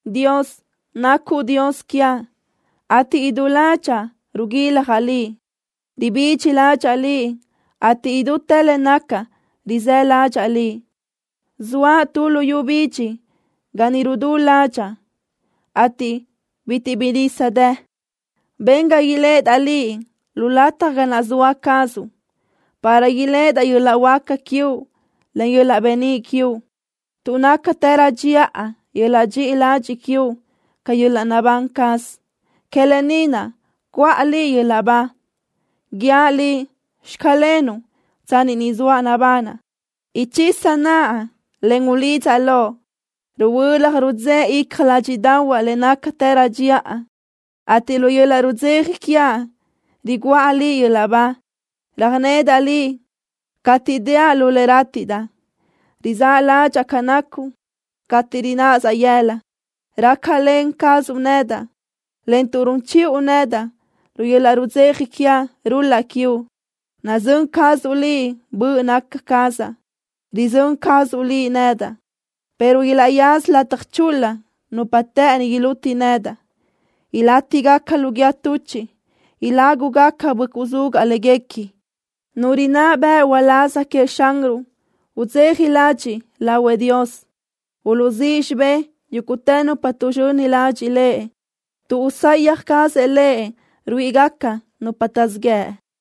Dios, nacuʼ Dios quiaʼ, ateʼ idú ládxaʼa ruguiljaʼ Liʼ. Ribidxi ládxaʼa Liʼ, ateʼ idútë le nacaʼ rizë́ ladxiʼ Liʼ. Zoaʼ tu luyú bidxi ga ni rudú ládxaʼa, ateʼ bitiʼ bi dë nisa. Ben ga iléʼedaʼ Liʼ lu lataj ga naʼ zoa cazuʼ, para iléʼedaʼ yöl-laʼ huáca quiuʼ, en yöl-laʼ beníʼ quiuʼ. Tuʼ nácatërö dxiʼa yöl-laʼ dxiʼi ladxiʼ quiuʼ ca yöl-laʼ naʼbán caz. Que lë ni naʼ cuʼa Liʼ yöl-laʼ ba. Guíaʼ Liʼ: “Xclenuʼ” tsanni ni zoaʼ nabanaʼ. Uchisaʼ naʼa, en ulidzaʼ Loʼ. Ruhuölaj rudzéʼe icja ládxiʼdaʼahuaʼ le nácatërö dxiʼa, ateʼ lu yöl-laʼ rudzeja quiaʼ riguʼa Liʼ yöl-laʼ ba. Röjnedaʼ Liʼ cateʼ déaʼ lu le rátiʼdaʼ. Rizáʼ ládxaʼa ca nacuʼ cateʼ rinaʼsaʼ yëla. Rácalen cazuʼ nedaʼ, en tuʼ run chiʼu nedaʼ, lu yöl-laʼ rudzeja quiaʼ rul-laʼ quiuʼ. Nazö́n cazuʼ Liʼ böʼ naca cazaʼ. Rizö́n cazuʼ Liʼ nedaʼ, pero ilaʼyaza lataj chul-la nupa të́ʼëni iluti nedaʼ. Ilátigaca lu guíë tuchiʼ. Ilágugaca böʼcuʼ zugaʼ léguequi. Nu rinná bëʼ uláz queëʼ Xanruʼ udzeja ladxiʼ lahuëʼ Dios. Uluʼzíʼ xibé yúguʼtë nupa tuʼzxöni ladxiʼ Lëʼ, tuʼ usayaj cazëʼ Lëʼ ruíʼigaca nupa taʼzíʼ yëʼ.